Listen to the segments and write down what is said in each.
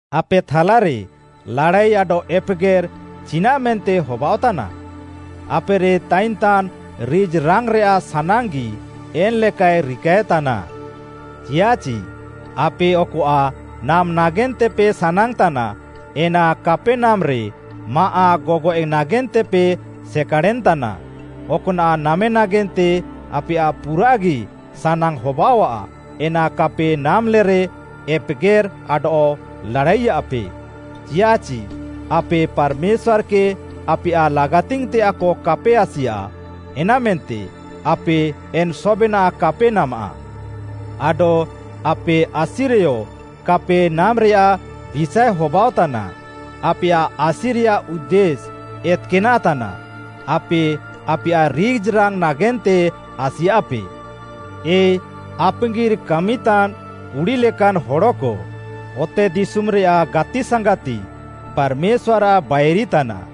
ଆପେ ଥାଲାରେ ଲାଡ଼ାଇ ଆଡଃ ଏପେଗେର୍‌ ଚିନାଃମେନ୍ତେ ହବାଅଃତାନା? ଆପେରେ ତାଇନ୍‌ତାନ୍‌ ରିଜ୍‌ରାଙ୍ଗ୍‌ରେୟାଃ ସାନାଙ୍ଗ୍‌ଗି ଏନ୍‌ ଲେକାଏ ରିକାଏତାନା। ଚିୟାଃଚି ଆପେ ଅକଆଃ ନାମ୍‌ ନାଗେନ୍ତେପେ ସାନାଙ୍ଗ୍‌ତାନା, ଏନା କାପେ ନାମେରେ ମାଆଃ ଗଗଏଃ ନାଗେନ୍ତେପେ ସେକାଡ଼େନ୍‌ ତାନା। ଅକ୍‌ନାଃ ନାମେ ନାଗେନ୍ତେ ଆପେୟାଃ ପୁରାଃଗି ସାନାଙ୍ଗ୍‌ ହବାଅଃଆ, ଏନା କାପେ ନାମ୍‌ଲେରେ ଏପେଗେର୍‌ ଆଡଃ ଲାଡ଼ାଇୟାଃପେ। ଚିୟାଃଚି ଆପେ ପାର୍‌ମେଶ୍ୱାର୍‌କେ ଆପେୟାଃ ଲାଗାତିଙ୍ଗ୍‌ତେୟାଃକ କାପେ ଆସିୟାଃ, ଏନାମେନ୍ତେ ଆପେ ଏନ୍‌ ସବେନାଃ କାପେ ନାମାଃ। ଆଡଃ ଆପେ ଆସିରେୟ କାପେ ନାମେରେୟାଃ ବିଷାଏ ହବାଅଃତାନା, ଆପେୟାଃ ଆସିରେୟାଃ ଉଦ୍ଦେଶ୍‌ ଏତ୍‌କାନାଃ ତାନାଃ। ଆପେ ଆପେୟାଃ ରିଜ୍‌ରାଙ୍ଗ୍‌ ନାଗେନ୍ତେ ଆସିୟାଃପେ। ଏ ଆପାଙ୍ଗିର୍‌ କାମିତାନ୍‌ କୁଡ଼ି ଲେକାନ୍‌ ହଡ଼କ, ଅତେଦିଶୁମ୍‌ରେୟାଃ ଗାତିସାଙ୍ଗାତି ପାର୍‌ମେଶ୍ୱାର୍‌ଆଃ ବାଇରି ତାନାଃ,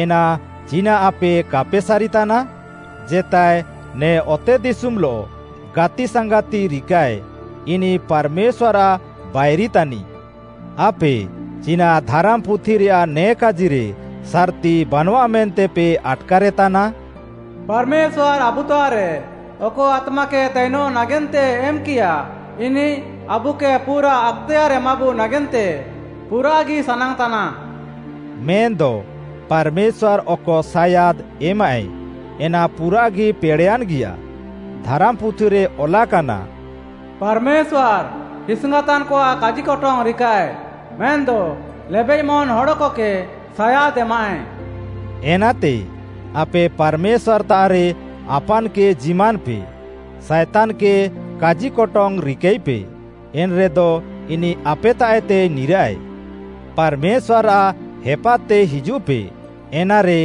ଏନା ଚିନାଃ ଆପେ କାପେ ସାରିତାନା? ଜେତାଏ ନେ ଅତେଦିଶୁମ୍‌ଲଃ ଗାତିସାଙ୍ଗାତି ରିକାଃଏ ଇନିଃ ପାର୍‌ମେଶ୍ୱାର୍‌ଆଃ ବାଇରି ତାନିଃ। ଆପେ ଚିନାଃ ଧାରାମ୍‌ପୁଥିରେୟାଃ ନେ କାଜିରେ ସାର୍‌ତି ବାନଃଆ ମେନ୍ତେପେ ଆଟ୍‌କାରେତାନା, “ପାର୍‌ମେଶ୍ୱାର୍‌ ଆବୁତାଃରେ ଅକ ଆତ୍ମାକେ ତାଇନଃ ନାଗେନ୍ତେ ଏମ୍‌କିୟା, ଇନିଃ ଆବୁକେ ପୁରା ଆକ୍‌ତେୟାର୍‌ବୁ ନାଗେନ୍ତେ ପୁରାଃଗି ସାନାଙ୍ଗ୍‌ତାନା?” ମେନ୍‌ଦ ପାର୍‌ମେଶ୍ୱାର୍‌ ଅକ ସାୟାଦ୍‌ ଏମାଃ, ଏନା ପୁରାଃଗି ପେଡ଼େୟାନ୍‌ଗିୟା। ଧାରାମ୍‌ପୁଥିରେ ଅଲାକାନା, “ପାର୍‌ମେଶ୍ୱାର୍‌ ହିସିଙ୍ଗାତାନ୍‌କଆଃ କାଜିକଟଙ୍ଗ୍‌ ରିକାଃଏ ମେନ୍‌ଦ ଲେବେଃମନ୍‌ ହଡ଼କକେ ସାୟାଦ୍‌ ଏମାଃଏ।” ଏନାତେ, ଆପେ ପାର୍‌ମେଶ୍ୱାର୍‌ତାଃରେ ଆପାନ୍‌କେ ଜିମାନ୍‌ପେ। ସାଏତାନ୍‌କେ କାଜିକଟଙ୍ଗ୍‌ ରିକାଇପେ। ଏନ୍‌ରେଦ ଇନିଃ ଆପେତାଃଏତେ ନିରାଃଏ। ପାର୍‌ମେଶ୍ୱାର୍‌ଆଃ ହେପାଦ୍‌ତେ ହିଜୁଃପେ, ଏନାରେ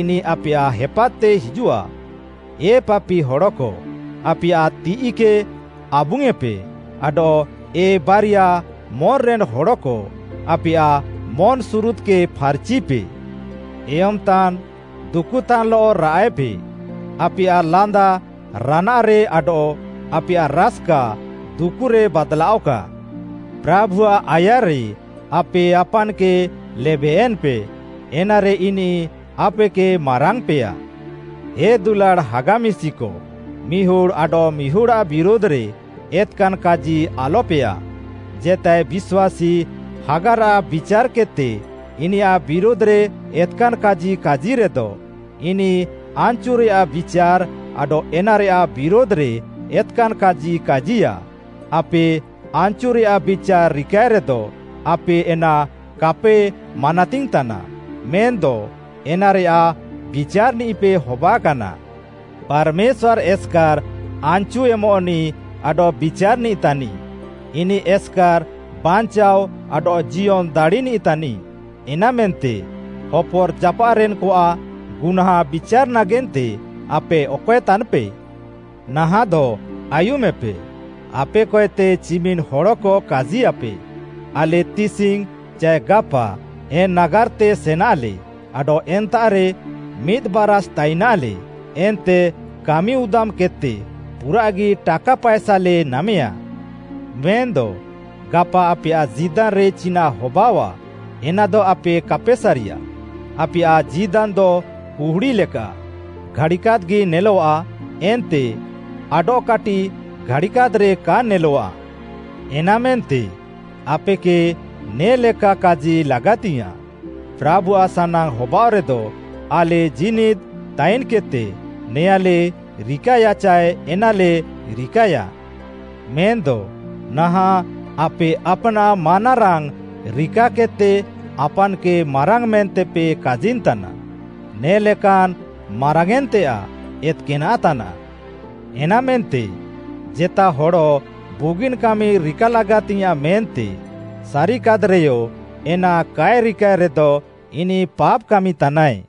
ଇନିଃ ଆପେୟାଃ ହେପାଦ୍‌ତେ ହିଜୁଃଆ। ଏ ପାପି ହଡ଼କ, ଆପେୟାଃ ତିଃଇକେ ଆବୁଙ୍ଗ୍‌ୟେଁପେ ଆଡଃ ଏ ବାରିୟା ମନ୍‌ରେନ୍‌ ହଡ଼କ, ଆପେୟାଃ ମନ୍‌ସୁରୁଦ୍‌କେ ଫାର୍‌ଚିପେ। ଏୟମ୍‌ତାନ୍‌, ଦୁକୁଃତାନ୍‌ଲଃ ରାଆଃଏପେ, ଆପେୟାଃ ଲାନ୍ଦା ରାନାଃରେ ଆଡଃ ଆପେୟାଃ ରାସ୍‌କା ଦୁକୁରେ ବାଦ୍‌ଲାଅଃକା। ପ୍ରାଭୁଆଃ ଆୟାର୍‌ରେ ଆପେ ଆପାନ୍‌କେ ଲେବେୟେନ୍‌ପେ, ଏନାରେ ଇନିଃ ଆପେକେ ମାରାଙ୍ଗ୍‌ପେୟା। ହେ ଦୁଲାଡ଼୍‌ ହାଗା ମିଶିକ, ମିହୁଡ଼୍‌ ଆଡଃମିହୁଡ଼୍‌ଆଃ ବିରୁଧ୍‌ରେ ଏତ୍‌କାନ୍‌ କାଜି ଆଲପେୟାଃ। ଜେତାଏ ବିଶ୍ୱାସୀ ହାଗାରାଃ ବିଚାର୍‌କେଦ୍‌ତେ ଇନିୟାଃ ବିରୁଧ୍‌ରେ ଏତ୍‌କାନ୍‌ କାଜି କାଜିରେଦ, ଇନିଃ ଆନ୍‌ଚୁରେୟାଃ ବିଚାର୍‌ ଆଡଃ ଏନାରେୟାଃ ବିରୁଧ୍‌ରେ ଏତ୍‌କାନ୍‌ କାଜି କାଜିୟା। ଆପେ ଆନ୍‌ଚୁରେୟାଃ ବିଚାର୍‌ ରିକାଏରେଦ, ଆପେ ଏନା କାପେ ମାନାତିଙ୍ଗ୍‌ତାନା, ମେନ୍‌ଦ ଏନାରେୟାଃ ବିଚାର୍‌ନିଃପେ ହବାକାନା। ପାର୍‌ମେଶ୍ୱାର୍‌ ଏସ୍‌କାର୍‌ ଆନ୍‌ଚୁ ଏମଃନିଃ ଆଡଃ ବିଚାର୍‌ନିଃ ତାନିଃ। ଇନିଃ ଏସ୍‌କାର୍‌ ବାଞ୍ଚାଅ ଆଡଃ ଜିୟନ୍‌ ଦାଡ଼ିନିଃ ତାନିଃ। ଏନାମେନ୍ତେ ହପର୍‌ଜାପାଃରେନ୍‌କଆଃ ଗୁହ୍ନାଁଁ ବିଚାର୍‌ ନାଗେନ୍ତେ ଆପେ ଅକଏ ତାନ୍‌ପେ? ନାହାଃଁଦ ଆୟୁମେପେ, ଆପେକଏତେ ଚିମିନ୍‌ହଡ଼କ କାଜିୟାଃପେ, “ଆଲେ ତିସିଙ୍ଗ୍‌ ଚାଏ ଗାପା ଏନ୍‌ ନାଗାର୍‌ତେ ସେନାଲେ, ଆଡଃ ଏନ୍ତାଃରେ ମିଦ୍‌ ବାରାଷ୍‌ ତାଇନାଲେ ଏନ୍ତେ କାମିଉଦାମ୍‌କେଦ୍‌ତେ ପୁରାଃଗି ଟାକା ପାଏସାଲେ ନାମେଁୟା।” ମେନ୍‌ଦ ଗାପା ଆପେୟାଃ ଜୀଦାନ୍‌ରେ ଚିନାଃ ହବାଅଃଆ, ଏନାଦ ଆପେ କାପେ ସାରିୟା! ଆପେୟାଃ ଜୀଦାନ୍‌ଦ କୁହୁଡ଼ି ଲେକା, ଘାଡ଼ିକାଦ୍‌ଗି ନେଲଃଆ ଏନ୍ତେ ଆଡଃକାଟିଃ ଘାଡ଼ିକାଦ୍‌ରେ କା ନେଲଃଆ। ଏନାମେନ୍ତେ ଆପେକେ ନେ'ଲେକା କାଜି ଲାଗାତିଙ୍ଗ୍‌ୟାଁଃ, “ପ୍ରାଭୁଆଃ ସାନାଙ୍ଗ୍‌ ହବାଅଃରେଦ, ଆଲେ ଜୀନିଦ୍‌ ତାଇନ୍‌କେଦ୍‌ତେ ନେଆଁଲେ ରିକାୟା ଚାଏ ଏନାଲେ ରିକାୟା।” ମେନ୍‌ଦ ନାହାଁଃ ଆପେ ଆପ୍‌ନାଃ ମାନାରାଙ୍ଗ୍‌ ରିକାକେଦ୍‌ତେ ଆପାନ୍‌କେ ମାରାଙ୍ଗ୍‌ ମେନ୍ତେପେ କାଜିନ୍‌ତାନା; ନେ'ଲେକାନ୍‌ ମାରାଙ୍ଗ୍‌ୟେଁନ୍‌ତେୟାଃ ଏତ୍‌କାନାଃ ତାନାଃ। ଏନାମେନ୍ତେ, ଜେତା ହଡ଼ ବୁଗିନ୍‌ କାମି ରିକା ଲାଗାତିଙ୍ଗ୍‌ୟାଁଃ ମେନ୍ତେ ସାରିକାଦ୍‌ରେୟ ଏନା କାଏ ରିକାଏ ରେଦ, ଇନିଃ ପାପ୍‌ କାମିତାନାଏ।